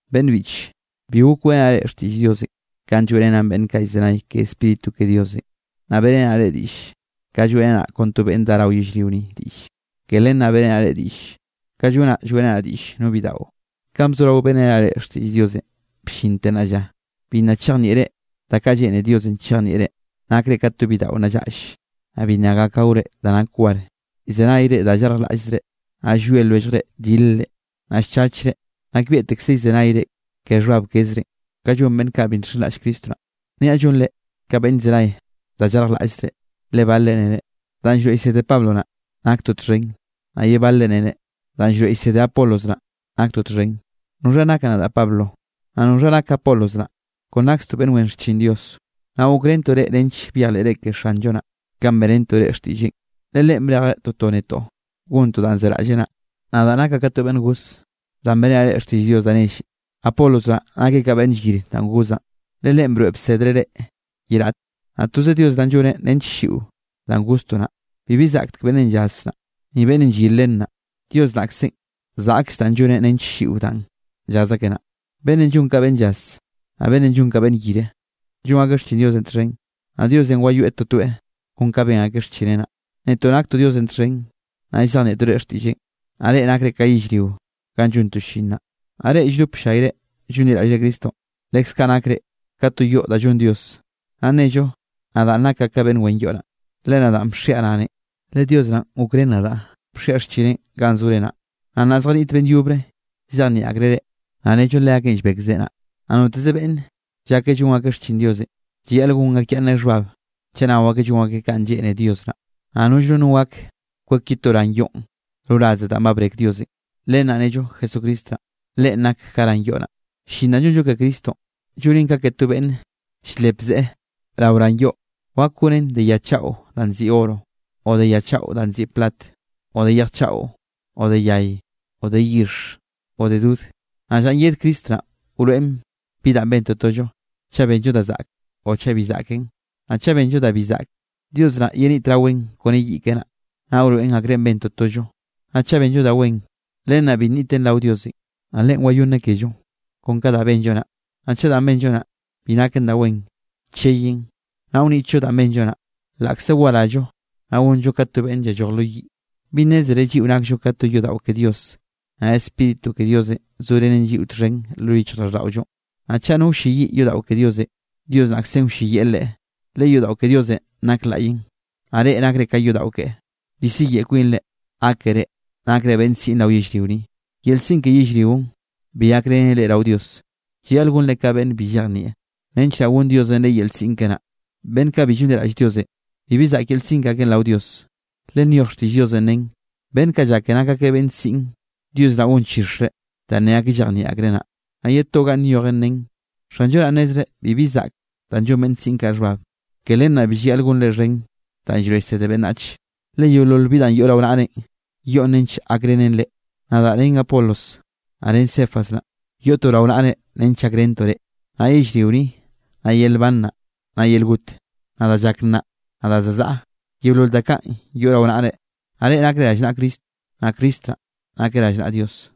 Beꞌnn biꞌche, bi gok weꞌrenaꞌ reꞌ xtiꞌll Diosenꞌ kanꞌ lloeꞌrenaꞌn beꞌnn kaꞌ llzenay ke Spíritu ke Diosenꞌ, naꞌ beꞌrenaꞌ reꞌ diꞌll ka lloeꞌrenaꞌ kon to beꞌnn dá rao yellrio ni diꞌlle. Ke len naꞌ beꞌrenaꞌ reꞌ diꞌll, ka llonaꞌ lloeꞌrenaꞌ diꞌll no bidaꞌo. Kanꞌ bzorao beꞌrenaꞌ reꞌ xtiꞌll Diosenꞌ bllinte nnaꞌ lla, bi nna chejnieꞌre da kaꞌ lleꞌne Diosenꞌ chejnieꞌre. Nakre ka to bidaꞌo nna llaꞌll, naꞌ bi nna gak gaore da nak war. Llzenayre da llarjlaꞌllzre. Naꞌ llwie lwelljre dilre, naꞌ llchachre, nakbieꞌtekze llzenayre ke xhbab kezrenꞌ, kanꞌ llon beꞌnn kaꞌ bi nxenraꞌll Cristo naꞌ. Niaꞌ llonre ka beꞌnn llzenay da llarjlaꞌllzre, le balre nere: “Danꞌ llroeꞌ llsede Pablo naꞌ, naktoꞌ txhen”, naꞌ ye balre nere: “Danꞌ llroeꞌ llsede Apolos naꞌ, naktoꞌ txhen.” ¿Noxha nakaꞌ nadaꞌ Pablo? Naꞌ ¿noxha nak Apolos naꞌ? Kon nakztoꞌ beꞌnn wen xchin Diosenꞌ. Naꞌ gokrentoꞌ reꞌ nench byejleꞌre ke Xanllo naꞌ, kanꞌ beꞌrentoꞌ reꞌ xtiꞌlleꞌn. Le Leꞌen brejeꞌ toto netoꞌ gontoꞌ danꞌ zeraꞌlleꞌ naꞌ. Nadaꞌ nakaꞌ ka to beꞌnn goz, danꞌ beꞌrenaꞌ reꞌ xtiꞌll Dios da nelle. Apolos naꞌ nakeꞌ ka beꞌnn llyire danꞌ gozaꞌn, le leꞌen broeꞌ bsedllreꞌ reꞌ ye raꞌte. Naꞌ toze Dios naꞌn lloneꞌ nench ll-lliꞌo danꞌ goztoꞌ naꞌ. Bibi zaꞌktek beꞌnnenꞌ llaz naꞌ, ni beꞌnnenꞌ llyir len naꞌ. Dios naꞌkzenꞌ zaꞌkll danꞌ lloneꞌ nench ll-lliꞌo danꞌ llaz akeꞌ naꞌ. Beꞌnnenꞌ llon ka beꞌnn llaz, naꞌ beꞌnnenꞌ llon ka beꞌnn llyir, llon akeꞌ xchin Diosenꞌ txhen. Naꞌ Diosenꞌ wayoeꞌ totoeꞌ kon kanꞌ ben akeꞌ xchineꞌ naꞌ. Netoꞌ naktoꞌ Diosenꞌ txhen, naꞌ llzejnieꞌtoꞌ reꞌ xtiꞌlleꞌn, naꞌ reꞌ nakre ka yellrio ganꞌ llontoꞌ llin naꞌ. Naꞌ reꞌ lldop ll-llayre llonliraꞌllre Cristonꞌ, leskaꞌ nakre ka to yoꞌ da llon Dios. Naꞌ nnello nadaꞌ nakaꞌ beꞌnn wen yoꞌ naꞌ, le nadaꞌn bxiaꞌ ranenꞌ, le Dios naꞌn gokrén nadaꞌ bxiaꞌ xchineꞌn ganꞌ zore naꞌ. Naꞌ nnaꞌ zjaniꞌt beꞌnn yobre llzejnieꞌ akreꞌ reꞌ, naꞌ nnello leakeꞌn llbek zeꞌe naꞌ. Naꞌ noteze beꞌnn llake llon akeꞌ xchin Diosenꞌ, llayaꞌl gon akyaꞌnneꞌ xhbab chaꞌ nao akeꞌ llon akeꞌ kanꞌ lleꞌne Dios naꞌ. Naꞌ nollre no gak kwek ye to ran yoꞌn roraze danꞌ ba brek Diosenꞌ, len naꞌ nnello Jesucristo naꞌn, Leꞌen nak ka ran yoꞌ naꞌ. Llin da llonllo ke Cristonꞌ, llonen ka ke to beꞌnn ll-lep to zeꞌe rao ran yoꞌ. Wak goneꞌn de ya chaꞌo danꞌ nziꞌi oro, o de ya chaꞌo danꞌ nziꞌi plat, o de yej chaꞌo, o de yay, o de yixh, o de dod. Naꞌ llanꞌ yed Cristo naꞌn wroeꞌn bi da ben totollo, chaꞌ benllo da zaꞌke o chaꞌ bi zaꞌken. Naꞌ chaꞌ benllo da bi zaꞌke, Dios naꞌ yenitraweꞌn kone yiꞌ keꞌe naꞌ, naꞌ wroeꞌn akrenꞌ ben totollo. Naꞌ chaꞌ benllo da wen, len naꞌ bi nniten rao Diosenꞌ, naꞌ Leꞌen wayonneꞌ kello kon ka danꞌ benllo naꞌ. Naꞌ chaꞌ danꞌ benllo naꞌ, bi naken da wen, cheyen, naꞌ wnitllo danꞌ benllo naꞌ, laꞌkze warallo, naꞌ gonllo ka to beꞌnn llalloj lo yiꞌ. ¿Bi nnézere lliꞌo nakllo ka to yodaꞌo ke Dios, naꞌ Spíritu ke Diosenꞌ zorenen lliꞌo txhen lo yichjraꞌlldaꞌollo? Naꞌ chaꞌ no wlleyiꞌ yodaꞌo ke Diosenꞌ, Dios naꞌkzenꞌ wlleyiꞌ leꞌe, le yodaꞌo ke Diosenꞌ nak laꞌyenꞌ, naꞌ reꞌ nakre ka yodaꞌo keꞌe. Bi siyeꞌe kwinre gákere nakre beꞌnn siꞌn rao yellrio ni, yel siꞌn ke yellrionꞌ bi gakrenen reꞌ rao Dios. Llayaꞌl gonre ka beꞌnn bi llejnieꞌ, nench naꞌ gonn Diosenꞌ reꞌ yel siꞌn keꞌe naꞌ. Beꞌnn kaꞌ bi llonliraꞌll Diosenꞌ, bibi zaꞌk yel siꞌn ke akeꞌn rao Dios. Le nyoj xtiꞌll Diosenꞌ nen: “Beꞌnn kaꞌ llake nak akeꞌ beꞌnn siꞌn, Dios naꞌ gonchixreꞌ danꞌ ne akeꞌ llejnieꞌ akreꞌ naꞌ.” Naꞌ ye to ganꞌ nyojen nen: “Xanllo naꞌn nnezreꞌ bibi zaꞌk danꞌ llon beꞌnn siꞌn kaꞌ xhbab.” Ke len naꞌ bi llayaꞌl gonre xhen da llroeꞌ llsede beꞌnnach, le yeolol bi da yoꞌ rao naꞌrenꞌ, yoꞌn nench gakrenen reꞌ. Nadaꞌ ren Apolos, naꞌ ren Cefas naꞌ, yoꞌtoꞌ rao naꞌre nench llakrentoꞌ reꞌ. Naꞌ yellrio ni, naꞌ yel nban naꞌ, naꞌ yel got, naꞌ da llak nnaꞌ, naꞌ da za zaꞌa, yeolol da kaꞌn yoꞌ rao naꞌre. Naꞌ reꞌ nakre rallnaꞌa Cristo, naꞌ Cristo naꞌ nakeꞌ rallnaꞌa Dios.